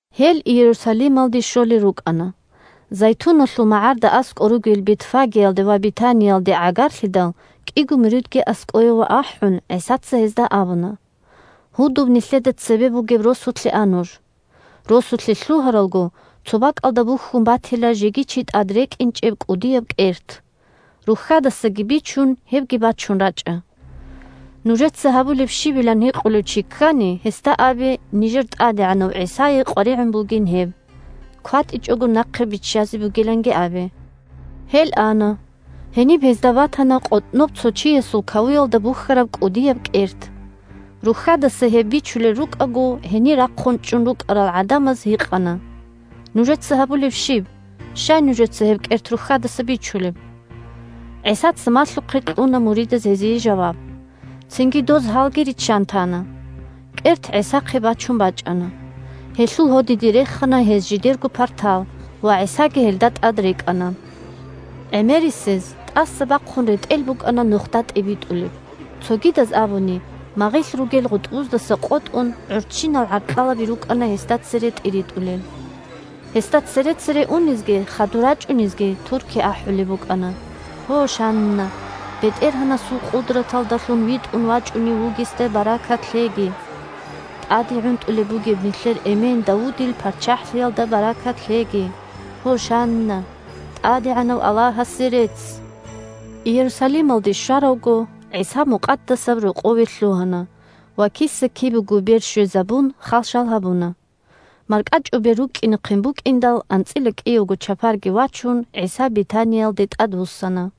Гьел Иерусалималде щолел рукӀана. Зайтуналъул магӀарда аскӀор ругел Бетфагиялде ва Бетаниялде гӀагарлъидал, кӀиго муридги аскӀове ахӀун, ГӀисаца гьезда абуна: – Гьудуб нилъеда цебе бугеб росулъе а нуж. Росулъе лъугьаралго, цо бакӀалда бухьун батила жеги чи тӀад рекӀинчӀеб кӀудияб кӀерт. Рухьадасаги бичун, гьебги бачун рачӀа. Нужеца гьабулеб щибилан гьикъулев чи ккани, гьесда абе нижер ТӀадегӀанав ГӀисае къваригӀун бугин гьеб; кватӀичӀого нахъе биччазе бугиланги абе. Гьел ана. Гьениб гьезда батана къотӀноб цо чиясул кавуялда бухьараб кӀудияб кӀерт. Рухьадаса гьеб бичулел рукӀаго, гьенир рахъун чӀун рукӀарал гӀадамаз гьикъана: – Нужеца гьабулеб щиб? Щай нужеца гьеб кӀерт рухьадаса бичулеб? ГӀисаца малъухъе кьуна муридаз гьезие жаваб. Цинги доз гьалги риччан тана. КӀерт ГӀисахъе бачун бачӀана. Гьелъул гьодиде рехана гьез жидерго партал, ва ГӀисаги гьелда тӀад рекӀана. ГӀемерисез, тӀаса бахъун ретӀел букӀана нухда тӀибитӀулеб. Цогидаз абуни, магъилъ ругел гъутӀбуздаса къотӀун, гӀурччинал гӀаркьалаби рукӀана гьесда цере тӀиритӀулел. Гьесда цере-цере унезги хадур рачӀунезги турки ахӀулеб букӀана: – Гьошанна! БетӀергьанасул къудраталдалъун витӀун вачӀунев вугесда баркат лъеги! ТӀаде гӀунтӀулеб бугеб нилъер эмен Давудил ПарччахӀлъиялда баркат лъеги! Гьошанна! ТӀадегӀанав Аллагьасе рецц! Иерусалималде щваравго, ГӀиса Мукъадасаб Рокъове лъугьана ва, киса-кибего бер щвезабун, хал-шал гьабуна. МаркӀачӀубер рукӀкӀинехъин букӀиндал, анцӀила кӀиявго чапарги вачун, ГӀиса Бетаниялде тӀадвуссана.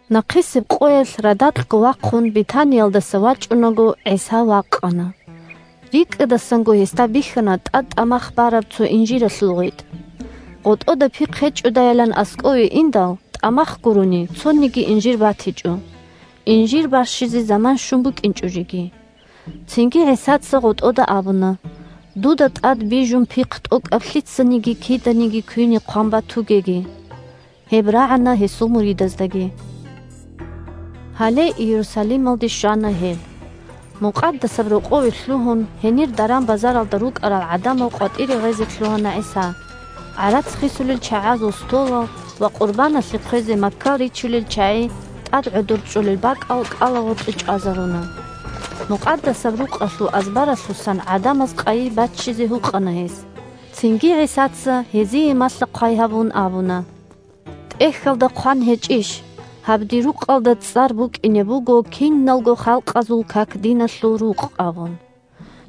Нахъисеб къоялъ радакьго вахъун Бетаниялдаса вачӀунаго, ГӀиса вакъана. РикӀкӀадасанго гьесда бихьана тӀад тӀамах бараб цо инжиралъул гъветӀ. ГъотӀода пихъ гьечӀодайилан аскӀове индал, тӀамах гурони, цониги инжир батичӀо: инжир барщизе заман щун букӀинчӀо жеги. Цинги ГӀисаца гъотӀода абуна: – Дуда тӀад бижун пихъ тӀокӀаб лъицаниги киданиги квине хъван батугеги. Гьеб рагӀана гьесул муридаздаги. Гьале Иерусалималде щвана гьел. Мукъадасаб Рокъове лъугьун, гьенир даран-базаралда рукӀарал гӀадамал къватӀире гъезе лъугьана ГӀиса; гӀарац хисулел чагӀазул столал ва къурбаналъе хъвезе маккал ричулел чагӀи тӀад гӀодор чӀолел бакӀал кӀалагъоркье чӀвазаруна. Мукъадасаб Рукъалъул азбаралъусан гӀадамаз къайи баччизеги гьукъана гьес. Цинги ГӀисаца, гьезие малъа-хъвай гьабун, абуна: – ТӀехьалда хъван гьечӀищ: «Гьаб Дир рукъалда цӀар букӀине буго киналго халкъазул как-диналъул рукъ», – абун.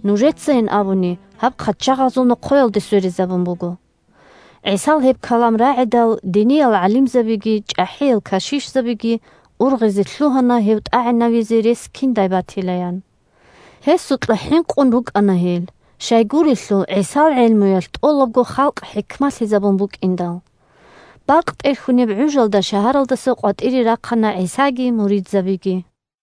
Нужецайин абуни гьаб хъачагъазул нохъоялде сверизабун буго. ГӀисал гьеб калам рагӀидал, диниял гӀалимзабиги чӀахӀиял кашишзабиги ургъизе лъугьана гьев тӀагӀинавизе рес киндай батилаян. Гьесукьа хӀинкъун рукӀана гьел, щайгурелъул ГӀисал гӀелмуялъ тӀолабго халкъ хӀикмалъизабун букӀиндал. Бакъ тӀерхьунеб гӀужалда шагьаралдаса къватӀире рахъана ГӀисаги муридзабиги.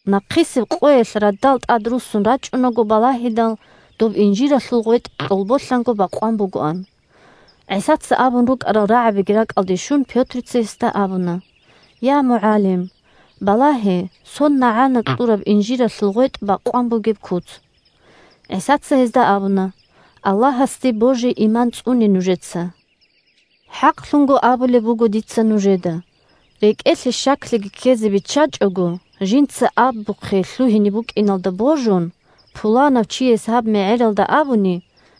Нахъисеб къоялъ радал тӀадруссун рачӀунаго балагьидал, доб инжиралъул гъветӀ кьолболъанго бакъван бугоан. ГӀисаца абун рукӀарал рагӀабиги ракӀалде щун, Пётрица гьесда абуна: – Я МугӀалим! Балагье, сон нагӀана кьураб инжиралъул гъветӀ бакъван бугеб куц. ГӀисаца гьезда абуна: – Аллагьасде божи-иман цӀуне нужеца. ХӀакълъун абулеб буго дица нужеда: рекӀелъе щаклъиги ккезе биччачӀого, жинца абухъе лъугьине букӀиналдаги божун, пуланав чияс гьаб мегӀералда абуни,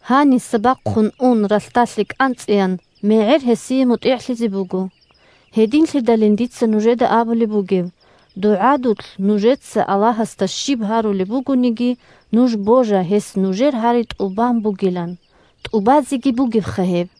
гьаниса бахъун ун ралъдалъе кӀанцӀеян, мегӀер гьесие мутӀигӀлъизе буго. Гьединлъидалин дица нужеда абулеб бугеб: дугӀадулъ нужеца Аллагьасда щиб гьарулеб бугониги, нуж божа гьес нужер гьари тӀубан бугилан. ТӀубазеги бугебха гьеб!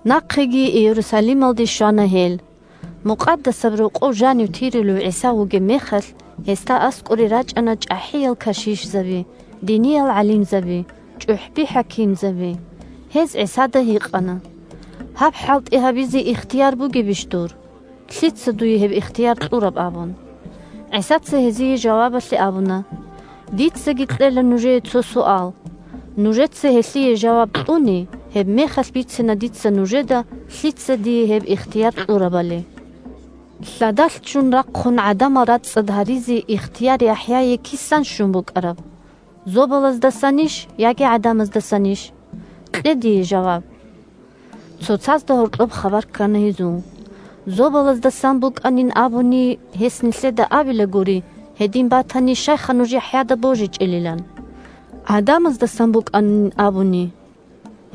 Нахъеги Иерусалималде щвана гьел. Мукъадасаб Рокъов жанив тирулев ГӀиса вугеб мехалъ, гьесда аскӀоре рачӀана чӀахӀиял кашишзаби, диниял гӀалимзаби, чӀухӀби-хӀакимзаби. Гьез ГӀисада гьикъана: – Гьаб хӀалтӀи гьабизе ихтияр бугебищ дур? Лъица дуе гьеб ихтияр кьураб? – абун. ГӀисаца гьезие жавабалъе абуна: – Дицаги кьела нужее цо суал. Нужеца гьелъие жаваб кьуни, гьебмехалъ бицина дица нужеда лъица дие гьеб ихтияр кьурабали. Лъадалъ ччун рахъун гӀадамал рацӀцӀад гьаризе ихтияр ЯхӀяе кисан щун букӀараб: зобалаздасанищ яги гӀадамаздасанищ? Кье дие жаваб. Цоцазда гьоркьоб хабар ккана гьезул. «Зобалаздасан букӀанин абуни, гьес нилъеда абилагури, гьедин батани, щайха нуж ЯхӀяда божичӀелилан. ГӀадамаздасан букӀанин абуни…»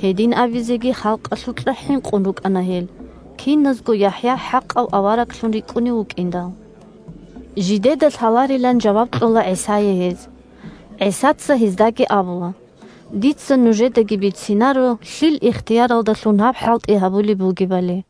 Гьедин абизеги, халкъалъукьа хӀинкъун рукӀана гьел, киназго ЯхӀя хӀакъав авараглъун рикӀкӀунев вукӀиндал. Жидеда лъаларилан жаваб кьола ГӀисае гьез. ГӀисаца гьездаги абула: – Дица нужедаги бицинаро лъил ихтияралдалъун гьаб хӀалтӀи гьабулеб бугебали.